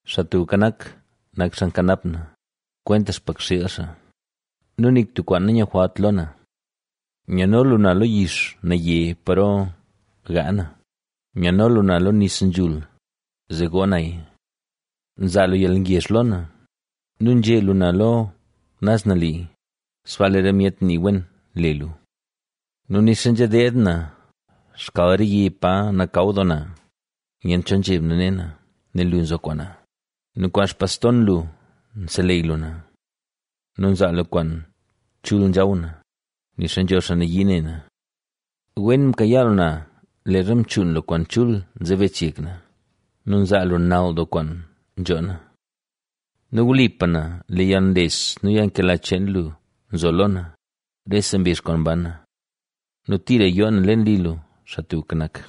Xaa Tubka Nak, nak xaa nkanap na, kwenta xpakxiil xaa nu nik tub kwaan nanyujwalt lo na. Nyano lu na lo yix naye, paro gaa na, nyano lu na lo nis nzhul, zee goo naya. Nzaa lu yalngezh lo na nu nzhe lu na lo naz nali, sbaa lee re myet nii wen le lu. Nu nixa nzha deed na xkal re yi pa nakaw doo na, nyent cho zheb na ne na, nel lu nzo kwaan na nu kwaan xpaston lu nseleyy lu na. Nu nzaa lu kwaan chul nzhaw na, nixa nzho xaa nayii ne na. Wen mkayaa lu na leezha mchuun lu kwaan chul nzebech yek na. Nu nzaa lu nal doo kwaan nzhoo na. Nu wlipa na, lee yalnles nu yalnkela cheen lu nzo lo na, rese mbizh kwaan ban na. Nu tira yoo na leen li lu, Xaa Tubka Nak.